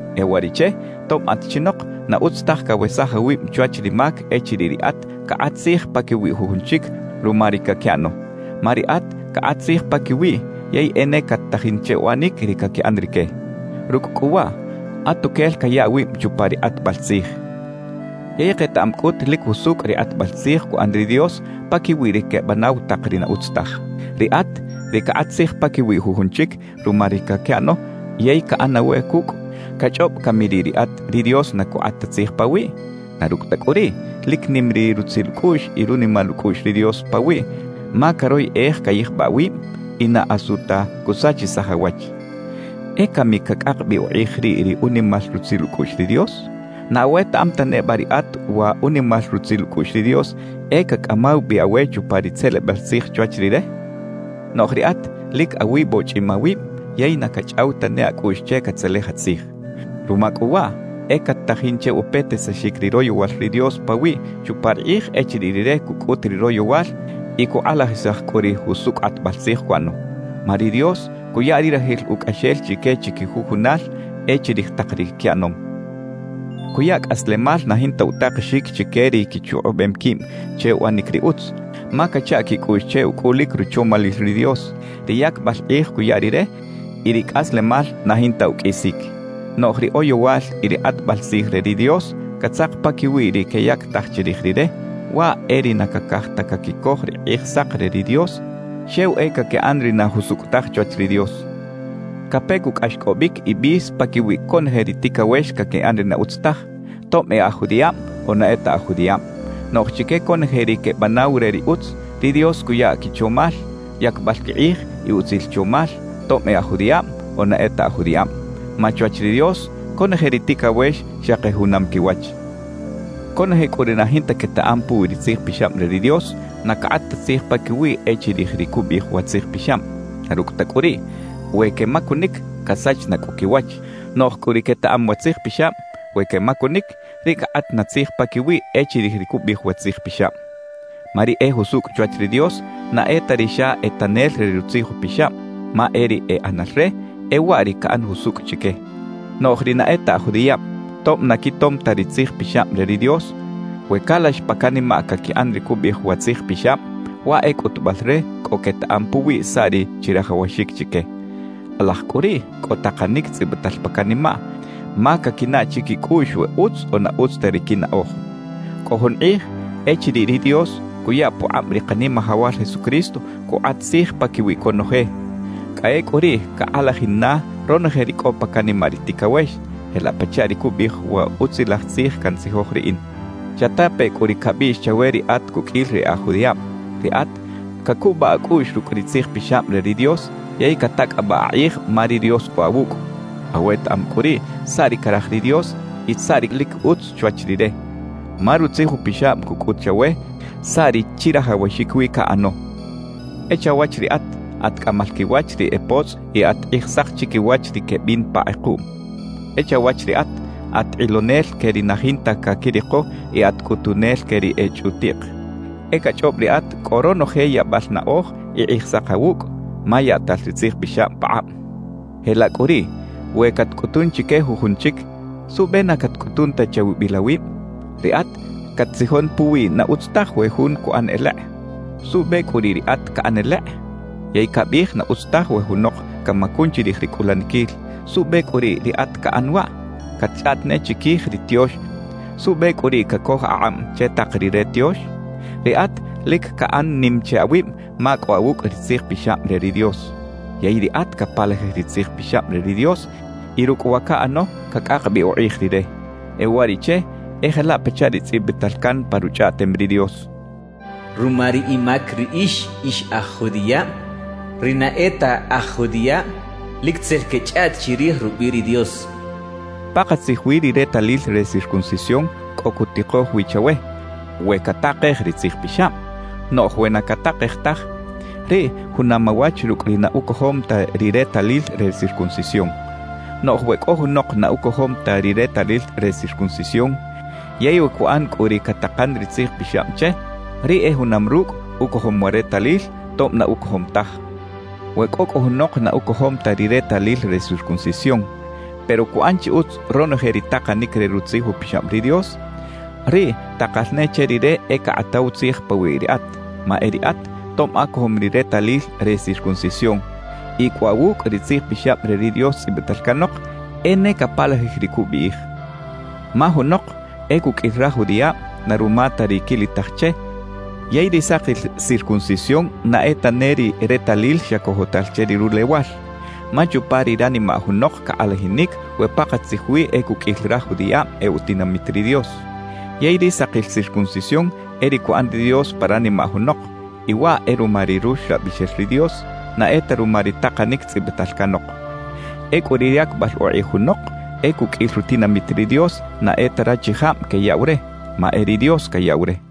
E uwariꞌche, tob at chinok, na utz taj cawesaj awib chwach ri mac echiriꞌ riꞌat cakꞌat tzij paquiwi jujun chic ruma ri caquiꞌano. Ma riꞌat cakꞌat tzij paquiwiꞌ yey e ne cat-tajin che uꞌanic ri caquiꞌan rique; rucꞌ cꞌu waꞌ atuquel caya awib chupa ri kꞌatbal tzij. Yey ketaꞌam cꞌut lic jusucꞌ ri kꞌatbal tzij cuꞌan ri Dios paquiwi ri quebanaw tak ri na utz taj. Riꞌat, ri cakꞌat tzij paquiwi jujun chic ruma ri caquiꞌano yey caꞌan awe cucꞌ, ¿cachꞌob cami riꞌ riꞌat ri Dios na cukꞌat ta tzij pawiꞌ? Na rucꞌ ta cꞌu riꞌ, lic nim ri rutzil ucꞌuꞌx y runimal ucꞌuꞌx ri Dios pawiꞌ, ma caroyꞌej cayijbaꞌ awib y na asu ta cusachisaj awach. ¿E cami cacꞌak bi ukꞌij riꞌ ri unimal rutzil ucꞌuꞌx ri Dios? ¿Na awetaꞌam ta neba riꞌat wa unimal rutzil ucꞌuꞌx ri Dios e cacꞌamaw bi awe chupa ri tzelebal tzij chwach Rire? Noꞌj riꞌat lic awibochꞌim awib yey na cachꞌaw tane acꞌuꞌx che catzelej atzij. Ruma cꞌu waꞌ e cat-tajin che upetisaxic ri royowal ri Dios pawiꞌ chupa ri kꞌij echiriꞌ Rire cucꞌut ri royowal y cukꞌalajisaj cꞌu ri jusucꞌ kꞌatbal tzij cuꞌano. Ma ri Dios cuya ri rajil ucꞌaxel chique chiquijujunal e chirij tak ri quiꞌanom. Cuya cꞌaslemal na jinta utakexic chique ri quichukꞌubem quib che uꞌanic ri utz, ma cacha quicꞌuꞌx che ucꞌulic ruchomalil ri Dios, ri yacbal kꞌij cuya Rire y ri cꞌaslemal na jinta uqꞌuisic. Noꞌj ri oyowal y ri kꞌatbal tzij re ri Dios catzak paquiwi ri queyactaj chirij Rire, waꞌ e ri na cacaj ta caquicoj ri Kꞌijsak re ri Dios, xew e caquiꞌan ri na jusucꞌ taj chwach ri Dios. Cape cꞌu cꞌaxcꞌobic y bis paquiwi conoje ri ticawex caquiꞌan ri na utz taj, tob e aj judiꞌab o na e ta aj judiꞌab. Noꞌj chique conoje ri quebanaw re ri utz, ri Dios cuya quichomal, yacbal quikꞌij y utzil chomal, tob e aj judiꞌab o na e ta aj judiꞌab. Ma chwach ri Dios conoje ri ticawex xaki junam quiwach. Conoje cꞌu ri na jinta quetaꞌam puwi ri Tzij Pixab re ri Dios, na cakꞌat ta tzij paquiwiꞌ e chirij ri cubiꞌij wa Tzij Pixab. Na rucꞌ ta cꞌu riꞌ, we quemacunic, casach na cꞌu quiwach. Noꞌj cꞌu ri quetaꞌam wa Tzij Pixab, we quemacunic, riꞌ cakꞌat na tzij paquiwiꞌ e chirij ri cubiꞌij wa Tzij Pixab. Ma ri e jusucꞌ chwach ri Dios na e ta ri xa e tanel re Rutzij Upixab; ma e ri e ꞌanal re, e waꞌ ri caꞌan jusucꞌ chique. Noꞌj ri na e ta aj judiꞌab, tob na quitom ta ri Tzij Pixab re ri Dios, we calax pa canimaꞌ caquiꞌan ri cubiꞌij wa Tzij Pixab, waꞌ e cꞌutubal re cꞌo quetaꞌam puwi saꞌ ri chirajawaxic chique. Kꞌalaj cꞌu riꞌ cꞌo takanic tzꞌibital pa canimaꞌ, ma caquinaꞌ chiquicꞌuꞌx we utz o na utz ta ri quinaꞌoj. Cꞌo jun kꞌij echiriꞌ ri Dios cuya pukꞌab ri Kanimajawal Jesucristo cukꞌat tzij paquiwi conoje; cꞌa ecꞌu riꞌ cakꞌalajin na ronoje ri cꞌo pa canimaꞌ ri ticawex, jelaꞌ pachaꞌ ri cubiꞌij wa Utzilaj Tzij cantzijoj riꞌin. Chatape cꞌu ri cabiꞌx chawe ri at cuqꞌuil ri e aj judiꞌab, riꞌat cacubaꞌ acꞌuꞌx rucꞌ ri Tzij Pixab re ri Dios yey catacꞌabaꞌ akꞌij ma ri Dios cꞌo awucꞌ. Awetaꞌam cꞌu riꞌ saꞌ ri caraj ri Dios y saꞌ ri lic utz chwach Rire, ma Rutzij Upixab cucꞌut chawe saꞌ ri chirajawaxic wi caꞌano. E chawach riꞌat, at cꞌamal quiwach ri e potzꞌ y at kꞌijsak chiquiwach ri quebin pa kꞌekuꞌm. E chawach riꞌat, at kꞌilonel que ri na jinta caquiriko y at cꞌutunel que ri e chꞌutiꞌk. E cachꞌob riꞌat cꞌo ronoje yaꞌbal naꞌoj y kꞌijsak awucꞌ, ma yaꞌtal ri Tzij Pixab pakꞌab. Jelaꞌ cꞌu riꞌ we catcꞌutun chique jujun chic, ¿suꞌbe na catcꞌutun ta chawibil awib? Riꞌat cat-tzijon puwiꞌ na utz taj we jun cuꞌan elekꞌ; ¿suꞌbe cꞌu riꞌ riꞌat caꞌan elekꞌ? Yey cabiꞌij na utz taj we junok camacun chirij ri cꞌulaniquil; ¿suꞌbe cꞌu riꞌ riꞌat caꞌan waꞌ? Catchꞌaꞌt ne chiquij ri tiox; ¿suꞌbe cꞌu riꞌ cacoj akꞌab che tak ri re tiox? Riꞌat lic caꞌan nim che awib ma cꞌo awucꞌ ri Tzij Pixab re ri Dios. ¡Yey riꞌat capalajij ri Tzij Pixab re ri Dios y rucꞌ wa caꞌano cacꞌak bi ukꞌij Rire! E uwariꞌche e jelaꞌ pachaꞌ ri tzꞌibital can pa Ruchꞌaꞌtem ri Dios: Ruma ri imac riꞌix ix aj judiꞌab, ri na e ta aj judiꞌab lic tzel quechꞌaꞌt chirij rubiꞌ ri Dios cachaꞌ. Pakatzij wi ri retalil re circuncisión cꞌo cutikoj wi chawe, we catakej ri Tzij Pixab. Noꞌj we na catakej taj, riꞌ junam awach rucꞌ ri na ucojom ta ri retalil re circuncisión. Noꞌj we cꞌo junok na ucojom ta ri retalil re circuncisión, yey we cuꞌan cꞌu ri catakan ri Tzij Pixab che, riꞌ e junam rucꞌ ucojom wa retalil, tob na ucojom taj. We cꞌo cꞌu junok na ucojom ta ri retalil re circuncisión, pero cuꞌan chi utz ronoje ri takanic re Rutzij Upixab ri Dios, riꞌ takal ne che rire e cakꞌataw tzij pawiꞌ riꞌat. Ma e riꞌat, tob acojom ri retalil re circuncisión y cꞌo awucꞌ ri Tzij Pixab re ri Dios tzꞌibital canok, e ne capalajij ri cubiꞌij. Ma junok e cuqꞌuil raj judiꞌab na ruma ta ri quilitaj che, yey ri sakil circuncisión na e tane ri retalil xa cojotal che ri rulewal. Ma chupa ri ranimaꞌ junok cakꞌalajinic we pakatzij wi e cuqꞌuil raj judiꞌab e utinamit ri Dios. Yey ri sakil circuncisión e ri cuꞌan ri Dios pa ranimaꞌ junok; y waꞌ e ruma ri Ruxlabixel ri Dios, na e ta ruma ri takanic tzꞌibital canok. Ecꞌu ri yacbal ukꞌij junok e cuqꞌuil rutinamit ri Dios na e ta rachijab queyaꞌw re, ma e ri Dios cayaꞌw re.